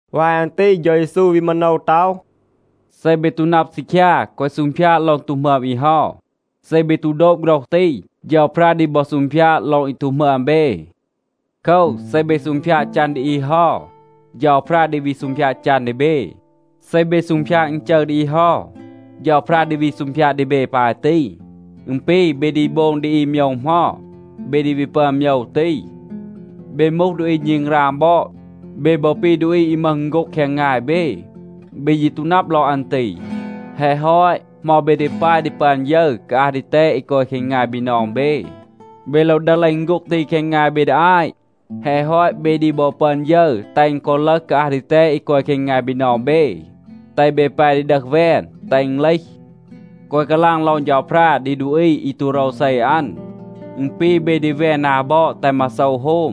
วาย อัน ตี เฌา เยซู วี มาโนว ต็อห, “เซ เบ ตู นับ ซีคยา, แกวะ ซูงพยาด ลอง ตู หมึอม อี เฮา. เซ เบ ตู โดบ โฆรห ตี, เฌาพรา ดี บอ ซูงพยาด ลอง อี ตู หมึอม เบ. โคว, เซ เบ ซูงพยาด จัน ดี อี เฮา, เฌาพรา ดี วี ซูงพยาด จัน ดี เบ. เซ เบ ซูงพยาด อึณจึร ดี อี เฮา, เฌาพรา ดี วี ซูงพยาด ดี เบ ปาย ตี. อึณ ปี, เบ ดี โบง ดี อี โมยว เหมา, เบ ดี วี ปึอน โมยว ตี. เบ มูห ดูอี ณึงราง บอด. เบ บอ ปี ดูอี อี มึห อึณโฆ็ง แคง งาย เบ. เบ ยี ตู นับ ลอง อัน ตี. แฮะ ฮอต, เหมา เบ ดี ปาย ดี ปึอน ยึร กาอัห ดีแตด อี กอย แคง งาย บีนอง เบ? เบ โลว ดึห เลห อึณโฆ็ง ตี แคง งาย เบ ดี อาต. แฮะ ฮอต, เบ ดี บอ ปึอน ยึร แตห อึณ กอ ลึห กาอัห ดีแตด อี กอย แคง งาย บีนอง เบ, แตห เบ แป ดี ดึห แวน, แตห อึณ เลห. แกวะ กาลาง ลอง เฌาพรา ดี ดูอี อี ตู โรวเซ อัน. อึณ ปี เบ ดี แวน นา บอด, แตห มาโซว โฮม.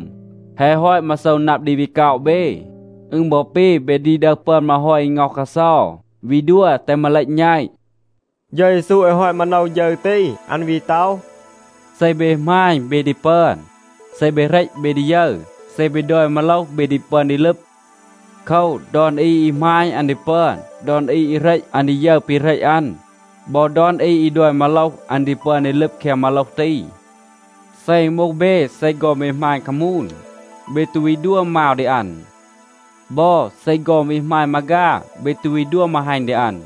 แฮะ ฮอต มาโซว นับ ดี วี ก็อะ เบ. อึณ บอ ปี, เบ ดี ดึห ปึอน มาฮอย อี ง็อห กาเซา, วี ดัว แตห มาเลต แณต.” เฌา เยซู แฮะ ฮอต มาโนว ฌึร ตี, อัน วี ต็อห, “เซ เบ หมาณ, เบ ดี ปึอน. เซ เบ เหรต, เบ ดี ยึร. เซ เบ ดอย มาโลห, เบ ดี ปึอน ดี ลึบ. โคว, ดอน อี อี หมาณ, อัน ดี ปึอน. ดอน อี อี เหรต, อัน ดี ยึร ปี เหรต อัน. บอ ดอน อี อี ดอย มาโลห, อัน ดี ปึอน ดี ลึบ แคง มาโลห ตี. เซ อึณ มูห เบ, เซ ฆอน เบ หมาณ คามูน, เบ ตู วี ดัว มาว ดี อัน. บอ, เซ ฆอน วี หมาณ มาฆา, เบ ตู วี ดัว มาฮัณ ดี อัน.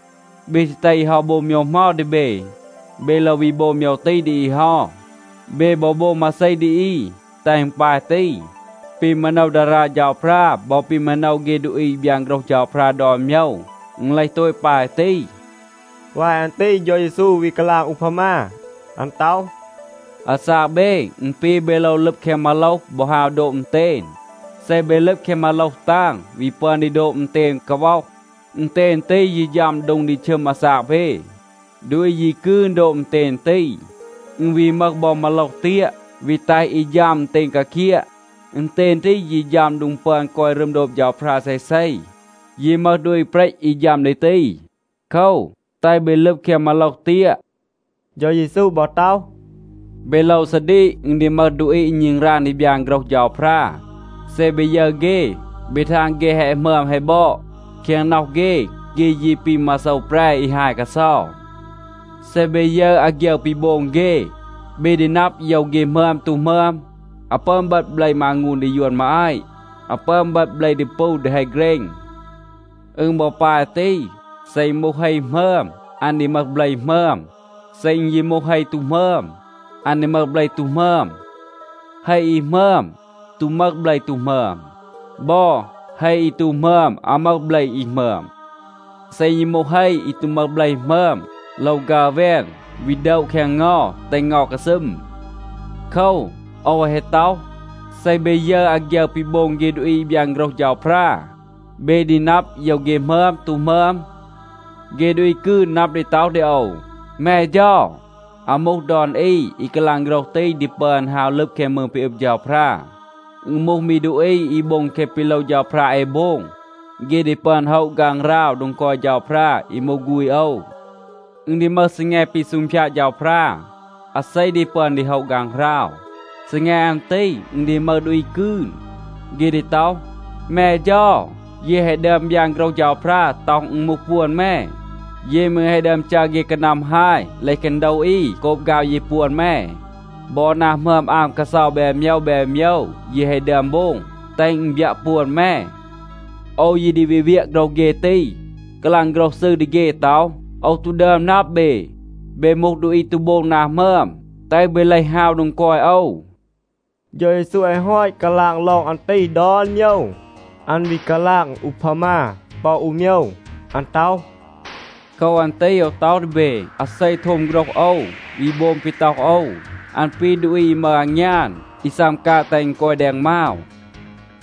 เบ ซี แตห อี เฮา โบง โมยว เหมา ดี เบ, เบ โลว วี โบง โมยว ตี ดี อี เฮา. เบ บอ โบง มาเซ ดี อี, แตห อึณ ปาย ตี. ปี มาโนว ดารา เฌาพรา บอ ปี มาโนว เฆ ดูอี อี บยาน โฆรห เฌาพรา ดอน โมยว, อึณ เลห โตต ปาย ตี.” วาย อัน ตี เฌา เยซู วี กาลาง อูพามา. อัน ต็อห, “อาซาก เบ, อึณ ปี เบ โลว ลึบ แคง มาโลห บอ ฮาว โดบ อึณเตณ. เซ เบ ลึบ แคง มาโลห ตาง, วี ปึอน โดบ อึณเตณ กาว็อห. อึณเตณ ตี ยี ฌัม โดง ดี ชึม อาซาก เบ. ดูอี ยี กืน โดบ อึณเตณ ตี. อึณ วี มึห บอ มาโลห เตียะ, วี แตห อี ฌัม อึณเตณ กาเคียะ. อึณเตณ ตี ยี ฌัม โดง ดี ปึอน กอย รึม โดบ เฌาพรา เซเซ. ยี มึห ดูอี เปรต อี ฌัม ดี ตี. โคว, แตห เบ ลึบ แคง มาโลห เตียะ.” เฌา เยซู บอ ต็อห, “เบ โลว ซาดีก, อึณ ดี มึห ดูอี อี ณึงราง ดี บยาน โฆรห เฌาพรา. เซ เบ ยึร เฆ, เบ ทาง เฆ แฮะ หมึอม แฮะ บอด. แคง น็อห เฆ, เฆ ยี ปี มาโซว แปร อี ฮาย กาเซา. เซ เบ ยึร อาฆยึร ปี โบง เฆ, เบ ดี นับ โยว เฆ หมึอม ตู หมึอม. อาว ปึอน เบต เบล มางูน ดี ยวน มาอาต. อาว ปึอน เบต เบล ดีปู ดี เฮ เกรณ. อึณ บอ ปาย ตี, เซ อึณ มูห เฮ หมึอม, อัน ดี มึห เบล หมึอม. เซ อึณ ยี มูห เฮ ตู หมึอม, อัน ดี มึห เบล ตู หมึอม. เฮ อี หมึอม ตู มึห เบล ตู หมึอม. บอ, เฮ อี ตู หมึอม อาว มึห เบล อี หมึอม. เซ อึณ ยี มูห เฮ อี ตู มึห เบล หมึอม, โลว ฆัร แวน, วี โดะ แคง เงา, แตห เงา กาซึม. โคว, โอว แฮะ ต็อห, เซ เบ ยึร อาฆยึร ปี โบง เฆ ดูอี อี บยาน โฆรห เฌาพรา, เบ ดี นับ โยว เฆ หมึอม ตู หมึอม. เฆ ดูอี กืน นับ ดี ต็อห ดี โอว ‘แม เฌา.’ อาว มูห ดอน อี อี กาลาง โฆรห ตี ดี ปึอน ฮาว ลึบ แคง มืง ปี อึบ เฌาพรา. อึณ มูห มี ดูอี อี โบง แคะ ปี โลว เฌาพรา เอ โบง, เฆ ดี ปึอน โฮะ ฆางหราว โดง กอย เฌาพรา, อี มูห ฆูณ โอว. อึณ ดี มึห ซีแง ปี ซูงพยาด เฌาพรา, อาเซ ดี ปึอน ดี โฮะ ฆางหราว. ซีแง อัน ตี อึณ ดี มึห ดูอี กืน, เฆ ดี ต็อห, ‘แม เฌา, เย แฮะ ดึอม บยาน โฆรห เฌาพรา, ต็อห อึณ มูห ปวน แม. เย มืร แฮะ ดึอม จัร เฆ กานัม ฮาย เลห แคง โดว อี โกบ ฆาว เย ปวน แม. บอ นา หมึอม อาม กาเซา แบน โมยว แบน โมยว เย แฮะ ดึอม โบง, แตห อึณ บยัะ ปวน แม.’ โอว ยี ดี วี เวียะ โฆรห เฆ ตี, กาลาง โฆรห ซืร ดี เฆ ต็อห, ‘โอว ตู ดึอม นับ เบ. เบ มูห ดูอี ตู โบง นา หมึอม. แตห เบ เลห ฮาว โดง กอย โอว.’” เฌา เยซู แฮะ ฮอต กาลาง ลอง อัน ตี ดอน โมยว, อัน วี กาลาง อูพามา ปอ อู โมยว. อัน ต็อห, “โคว อัน ตี โอว ต็อห ดี เบ, อาเซ โทม โฆรห โอว, วี โบง ปี ต็อห โอว, อัน ปี ดูอี อี มึห อางยาน, อี ซัม กาง, แตห อึณ กอย แดง มาว.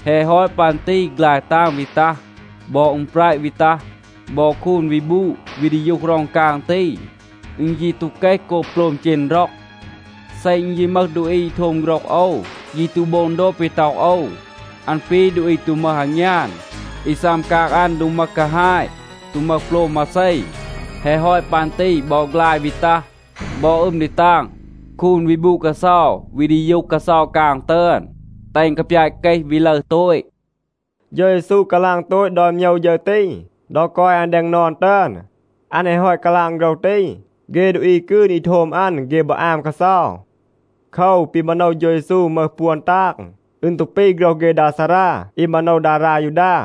แฮะ ฮอต ปัน ตี ฆลาย ตาง วี ตัห. บอ อึม แประ วี ตัห, บอ คูน วี บูด, วี ดียูห ร็อง กาง ตี. อึณ ยี ตู เกห โกบ โปลม เจณ ร็อง. เซ อึณ ยี มึห ดูอี อี โทม โฆรห โอว, ยี ตู โบง โดบ ปี ต็อห โอว, อัน ปี ดูอี ตู มึห อางยาน, อี ซัม กาง อัน โดง มึห กาฮาต, ตู มึห โปลม มาเซ. แฮะ ฮอต ปัน ตี บอ ฆลาย วี ตัห, บอ อึม ดี ตาง. คูน วี บูด กาเซา, วี ดียูห กาเซา กาง ตึอน, แตห อึณ กาปยาต เกห, วี ลึร โตต.” เฌา เยซู กาลาง โตต ดอน โมยว ฌึร ตี ดอ กอย อัน แดง นอน ตึอน. อัน แฮะ ฮอต กาลาง โฆรห ตี, เฆ ดูอี กืน อี โทม อัน, เฆ บอ อาม กาเซา. โคว, ปี มาโนว เฌา เยซู มึห ปวน ตาง, อึณ ตู ปี โฆรห เฆ ดา ซารา อี มาโนว ดารา ยูดา.